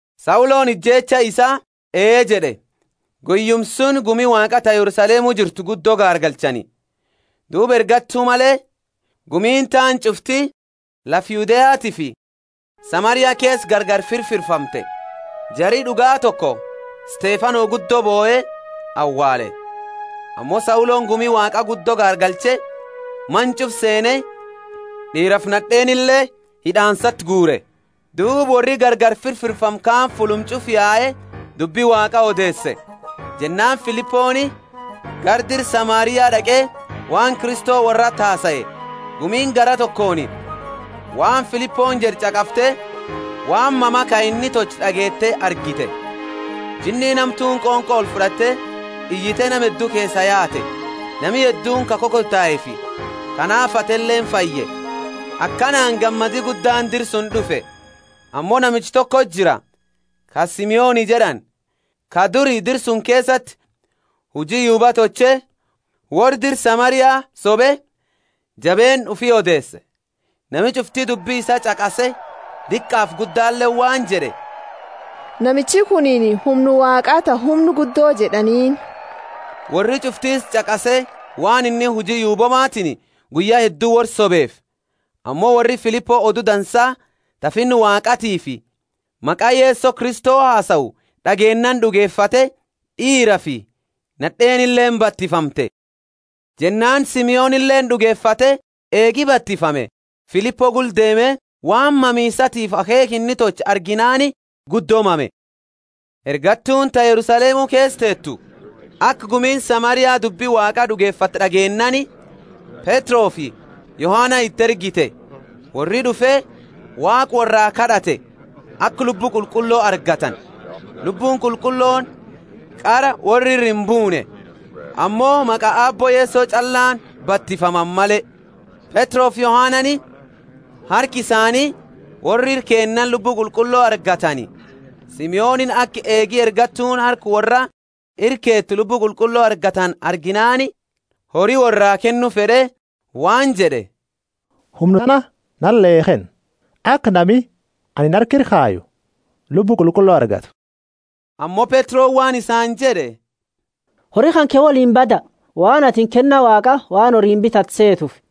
Sauloni ijeecha isaa Ee jed'e. Sauloni gumi Waaqa gaargalcha Guyyuma suni gumi Waaqa ta Yerusalemu jirtu guddo gaargalchani. Duuba ergattu male gumiini taani ch'ufti lafa Yudeatiifi Samaria keesa gargari firfirfamte. Jari d'ugaa toko Stefano guddo bohe awaale. Ammo Sauloni gumi Waaqa guddo gaargalche, mana ch'ufa seene, d'iirafi nad'eenile hid'aansati guure. Duuba worri gargari firfirfame kaani fulluma ch'ufa yae dubbi Waaqa odeese. Jennaani Filiponi gara dira Samaria d'aqe waan Kristo worrati hasae. Gumiini garaa tokooni waan Filiponi jed'e ch'aqafte, waan mama ka inni tolche d'ageete argite. Jinniini hamtuuni qonqo olfud'atte iyite nama heddu keesaa yaate; nami hedduuni ka kokotaefi ka naafate fayye. Akanaani gammadi guddaani dira suni d'ufe. Ammo namicha tokoti jira, ka Simoni jed'ani, ka duri dira suni keesati huji yuuba tolche, worra dira Samaria, sobe, jabeenna ufi odeese. Nami ch'ufti dubbi isaa ch'aqase, diqaafi guddaleeni waan jed'e, Namichi kunini humna Waaqa ta Humna Guddo jed'aniini. Worri ch'ufti isa ch'aqase waan inni huji yuuboomatiini guyya heddu worra sobeefi. Ammo worri Filipo Odu Dansa ta Finna Waaqatiifi maqa Yeso Kristo hasau d'ageennaani d'ugefate, d'iirafi nad'eenileeni batifamte. Jennaani Simonileeni d'ugefate; eegi batifame, Filipo gula deeme, waan mamiisatiifi akheekha inni tolche arginaani guddo mame. Ergattuuni ta Yerusalemu keesa teetu aka gumiini Samaria dubbi Waaqa d'ugefatte d'ageennaani, Petrofi Yohana iti ergite. Worri d'ufe, Waaqa worraa kad'ate, aka Lubbu Qulqullo argatani. Lubbuuni Qulqullooni qara worra ira imbuune, ammo maqa Aabbo Yeso ch'allaani batifamani male. Petrofi Yohanani harka isaani worra ira keennaani Lubbu Qulqullo argatani. Simonini aka eegi ergattuuni harka worra ira keete Lubbu Qulqullo argatani arginaani, hori worraa kennu fed'e waan jed'e, Humna tana nale kenna, aka nami anini harka ira kayu Lubbu Qulqullo argatu. Ammo Petroni waan isaani jed'e, Hori kanke woliini bada, waan atini kenna Waaqa waan horiini bitatu seetefi.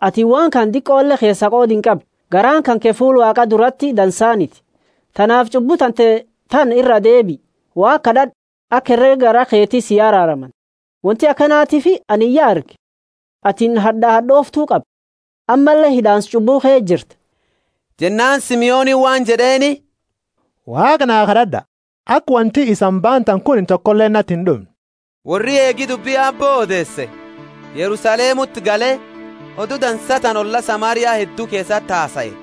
Atini waan kana keesa diqole qooda inqabdu, garaani kanke fuula Waaqa durati dansaniti. Tanaafi ch'ubbu tante tana iraa deebii, Waaqa kad'ad'u, aka herega garaa keti si araaramani. Wonti akanatiifi anini ya arge, atini had'aa had'ooftu qabda, ammalle hid'aansa ch'ubbuu ke jirta. Jennaani Simonini waan jed'eeni, Waaqa na kad'ad'a, aka wonti isani baantani kunini tokoleeni nati ind'umne. Worri eegi dubbi Aabbo odeese, Yerusalemuti gale, Odu Dansa tana olla Samaria heddu keesati hasae.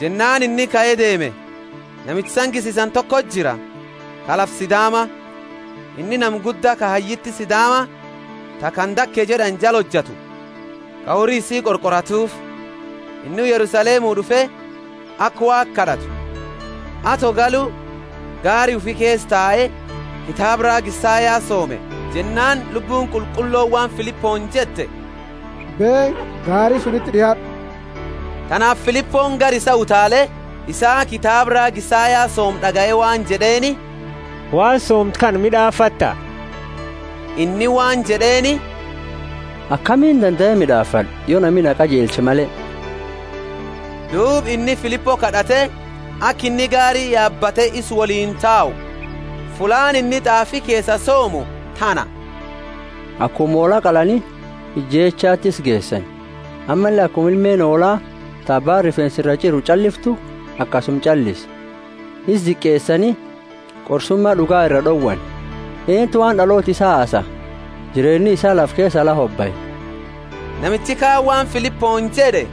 Jennaani inni kae deeme. Namicha sangisisani toko jira, ka lafa Sidaama. Inni nama gudda ka hayyiti Sidaama ta Kandake jed'ani jala hojatu, ka hori isii qorqoratuufi. Inni Yerusalemu d'ufe, aka Waaqa kad'atu. Ato galu, gaari ufi keesa tae, kitaaba raaga Isaya soome. Jennaani Lubbuuni Qulqullooni waan Filiponi jette, Beeni, gaari sunti d'iaad'u. Tanaafi Filiponi gara isaa utaale, isa kitaaba raaga Isaya soomu d'agaye waan jed'eeni, Waan soomtu kana mid'aafatta? Inni waan jed'eeni, Akamiini dandae mid'aafad'a, yo nami na qajeelche male? Duuba inni Filipo kad'ate aka inni gaari yaabate isa woliini tau. Fullaani inni t'aafi keesa soomu tana, Akuma hoola qalani ijeechati isa geesani, ammalle akuma ilmeeni hoola ta abbaani rifeensa iraa ch'iru ch'alliftu, akasuma ch'allise. Isa diqeesani, qorsuma d'uga iraa d'owani. Eenuti waan d'aloota isaa hasaa? Jireenni isaa lafa keesaa la hobae. Namichi kaani waan Filiponi jed'e,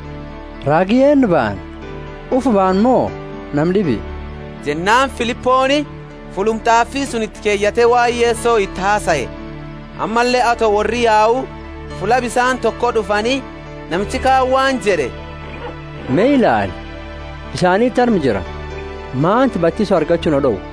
Raagi eennu baana? Ufi baana mo nama d'ibi? Jennaani Filiponi fulluma t'aafi suni iti keyate waan Yeso isati hasae. Ammalle ato worri yau, fulla bisaani toko d'ufani; namichi kaani waan jed'e, Me ilaali, bisaaniti arma jira, malti batiso argachu naa d'owa? [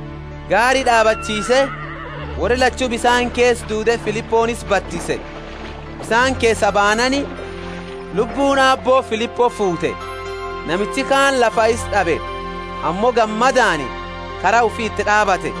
Gaari d'aabachiise, worri lachu bisaani keesa duude Filiponi isa batise. Bisaani keesa baanaani, Lubbuuni Aabbo Filipo fuute. Namichi kaani lafaa isa d'abe, ammo gammadaani kara ufii iti d'aabate.